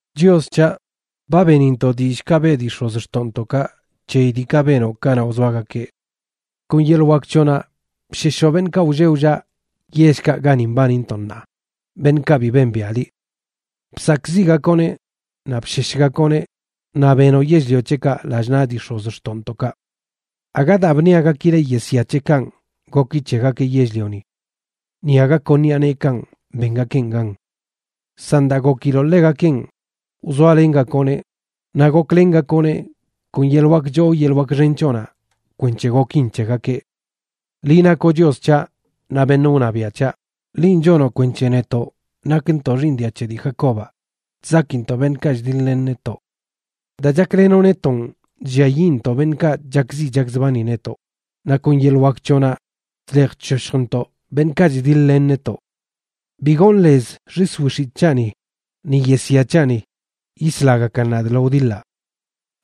Chios c̱haꞌ, ba benintoꞌ dillꞌkaꞌ beꞌ dii x̱ozxtoꞌntoꞌkaꞌ c̱heyi diikaꞌ benoꞌ kanaꞌ wzoagakeꞌ. Kon yeḻꞌ wak c̱hoꞌnaꞌ bsheshoꞌ beṉꞌkaꞌ wlleꞌ wllaꞌ yellkaꞌ gani mbanintoꞌ ṉaa, beṉꞌkaꞌ bi bembiaꞌ liꞌ. Bsakꞌziꞌgakoꞌneꞌ naꞌ bsheshgakoꞌneꞌ naꞌ benoꞌ yell-lio c̱heꞌkaꞌ lallꞌ naꞌ dii x̱ozxtoꞌntoꞌkaꞌ. Aga daa bṉiagakileꞌ yesya c̱heꞌkanꞌ goki c̱hegakeꞌ yell-lioni, ni aga kon ṉiꞌa neekanꞌ bengakeꞌn gan. San daa gokiloꞌ ḻegakenꞌ, wzoalengakoꞌneꞌ naꞌ goklengakoꞌneꞌ kon yeḻꞌ wak choo yeḻꞌ wak xen c̱hoꞌnaꞌ kwenc̱he gokin c̱hegakeꞌ. Liꞌ nakoꞌ Chios c̱haꞌ naꞌ beṉꞌ wṉabiaꞌ c̱haꞌ, linꞌ chonoꞌ kwenc̱he netoꞌ, nakntoꞌ xiiṉ dia c̱he dii Jacobaꞌ, chzakintoꞌ beṉꞌkaꞌ chdiḻ-len netoꞌ. Daa chaklenoꞌ netonꞌ, chlliayiꞌntoꞌ beṉꞌkaꞌ chakziꞌ chakzbani netoꞌ; naꞌ kon yeḻꞌ wak c̱hoꞌnaꞌ chlej chshoshjntoꞌ beṉꞌkaꞌ chdiḻ-len netoꞌ. Bi gonꞌ lez xis wix̱itꞌ c̱haꞌni, ni yesya c̱haꞌni yislagakan nadꞌ lo wdiḻaꞌ.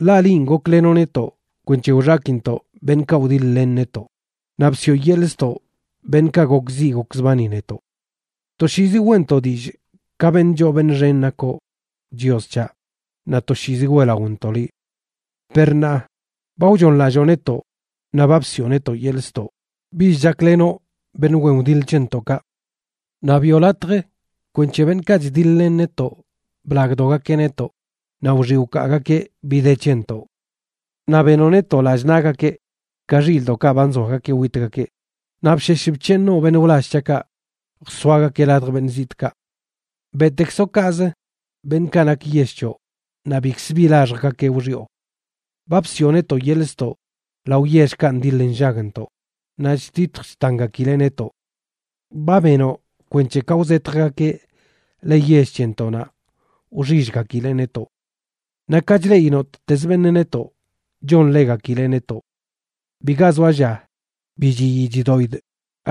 Ḻaꞌ linꞌ goklenoꞌ netoꞌ kwenc̱he wxakintoꞌ beṉꞌkaꞌ wdiḻ-len netoꞌ, naꞌ bsiꞌo yeḻꞌ ztoꞌ beṉꞌkaꞌ gokziꞌ gokzbani netoꞌ. Toshiizi weꞌntoꞌ dillꞌ ka beṉꞌ choo beṉꞌ xen nakoꞌ, Chios c̱haꞌ, naꞌ toshiizi weꞌlaꞌontoꞌ liꞌ. Per ṉaa, ba wchooṉlalloo netoꞌ; naꞌ ba bsiꞌo netoꞌ yeḻꞌ ztoꞌ. Bich chaklenoꞌ beṉꞌ wen wdiḻꞌ c̱hentoꞌkaꞌ. Naꞌ biꞌo latj kwenc̱he beṉꞌkaꞌ chdiḻ-len netoꞌ blagdogakeꞌ netoꞌ, naꞌ wxiꞌ wkaagakeꞌ bi de c̱hentoꞌ. Naꞌ benoꞌ netoꞌ lallꞌ naꞌgakeꞌ ka xilꞌdoꞌkaꞌ ba nzoagakeꞌ witgakeꞌ; naꞌ bshesh bc̱heeṉoꞌ beṉꞌ wlall c̱haꞌkaꞌ jsoagakeꞌ ladj beṉꞌ zitꞌkaꞌ. Beꞌtekzoꞌ kaꞌzə beṉꞌkaꞌ nak yell c̱hoꞌ, naꞌ bikz bi laxjgakeꞌ wxiꞌo. Ba bsiꞌo netoꞌ yeḻꞌ ztoꞌ lao yellkaꞌ ndiḻ nllagntoꞌ, naꞌ chtitj chtangakileꞌ netoꞌ. Ba benoꞌ kwenc̱he ka wzetjgakeꞌ le yell c̱hentoꞌnaꞌ wxillgakileꞌ netoꞌ. Naꞌ ka chleꞌi nottezə beṉꞌ netoꞌ, chonḻegakileꞌ netoꞌ. Biga zoa lla bi chiyii chidoꞌidꞌ,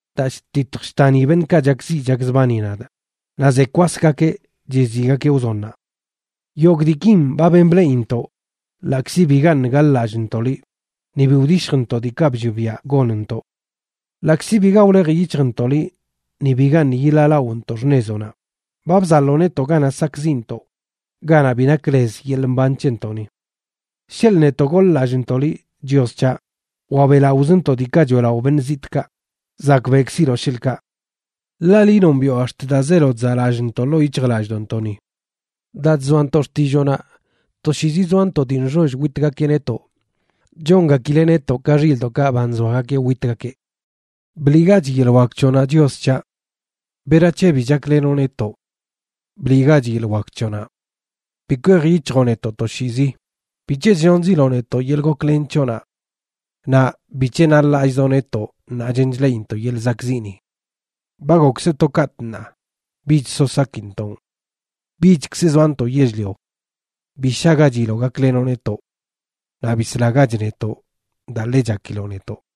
daa chtitj chtani beṉꞌkaꞌ chakziꞌ chakzbani nadꞌ naꞌ ze kwasgakeꞌ chiziꞌgakeꞌ wzonnaꞌ. Yogꞌ diikin ba ben bleꞌintoꞌ ḻaꞌkzi bigaṉꞌ gaḻ-lallꞌntoꞌ liꞌ ni bi wdishjntoꞌ diikaꞌ bllioꞌ biaꞌ gonntoꞌ. Ḻaꞌkzi biga wlej yic̱hjntoꞌ liꞌ ni bigaṉꞌ yiḻaalaꞌontoꞌ xṉezoꞌnaꞌ, ba bzaḻoo netoꞌ ganaꞌ sakꞌziꞌntoꞌ, ganaꞌ bi nak lez yeḻꞌ mban c̱hentoꞌni. Sheḻꞌ netoꞌ goḻ-lallꞌntoꞌ liꞌ, Chios c̱haꞌ, wa beꞌlaꞌozntoꞌ diikaꞌ choeꞌlaꞌo beṉꞌ zitꞌkaꞌ, zakbeꞌkziloꞌ sheḻꞌkaꞌ. Ḻaꞌ liꞌ nombiꞌo ax̱t daa zeelo chzaꞌlallꞌntoꞌ ḻoo yic̱hjlallꞌdoꞌntoꞌni. Daa chzoantoꞌ xtilloonaꞌ, toshiizi zoantoꞌ dii nxoll witgakeꞌ netoꞌ. Chongakileꞌ netoꞌ ka xilꞌdoꞌkaꞌ ba nzoagakeꞌ witgakeꞌ. Bliꞌgach yeḻꞌ wak c̱hoꞌnaꞌ, Chios c̱haꞌ. ¿Berac̱he bi chaklenoꞌ netoꞌ? Bliꞌgach yeḻꞌ wak c̱hoꞌnaꞌ. Bi kwej yic̱hjoꞌ netoꞌ toshiizi. ¿Bic̱he chllonziloꞌ netoꞌ yeḻꞌ goklen c̱hoꞌnaꞌ? Naꞌ ¿Bic̱he naḻ-lallꞌzoꞌ netoꞌ ṉaa chen chleꞌintoꞌ yeḻꞌ zakꞌziꞌni? Ba gokzə to katꞌ ṉaa, bich so sakintoꞌn. Bichkz zoantoꞌ yell-lio. Bi shaꞌgachiloꞌ gaklenoꞌ netoꞌ. Naꞌ bislagach netoꞌ daa ḻe chakiloꞌ netoꞌ.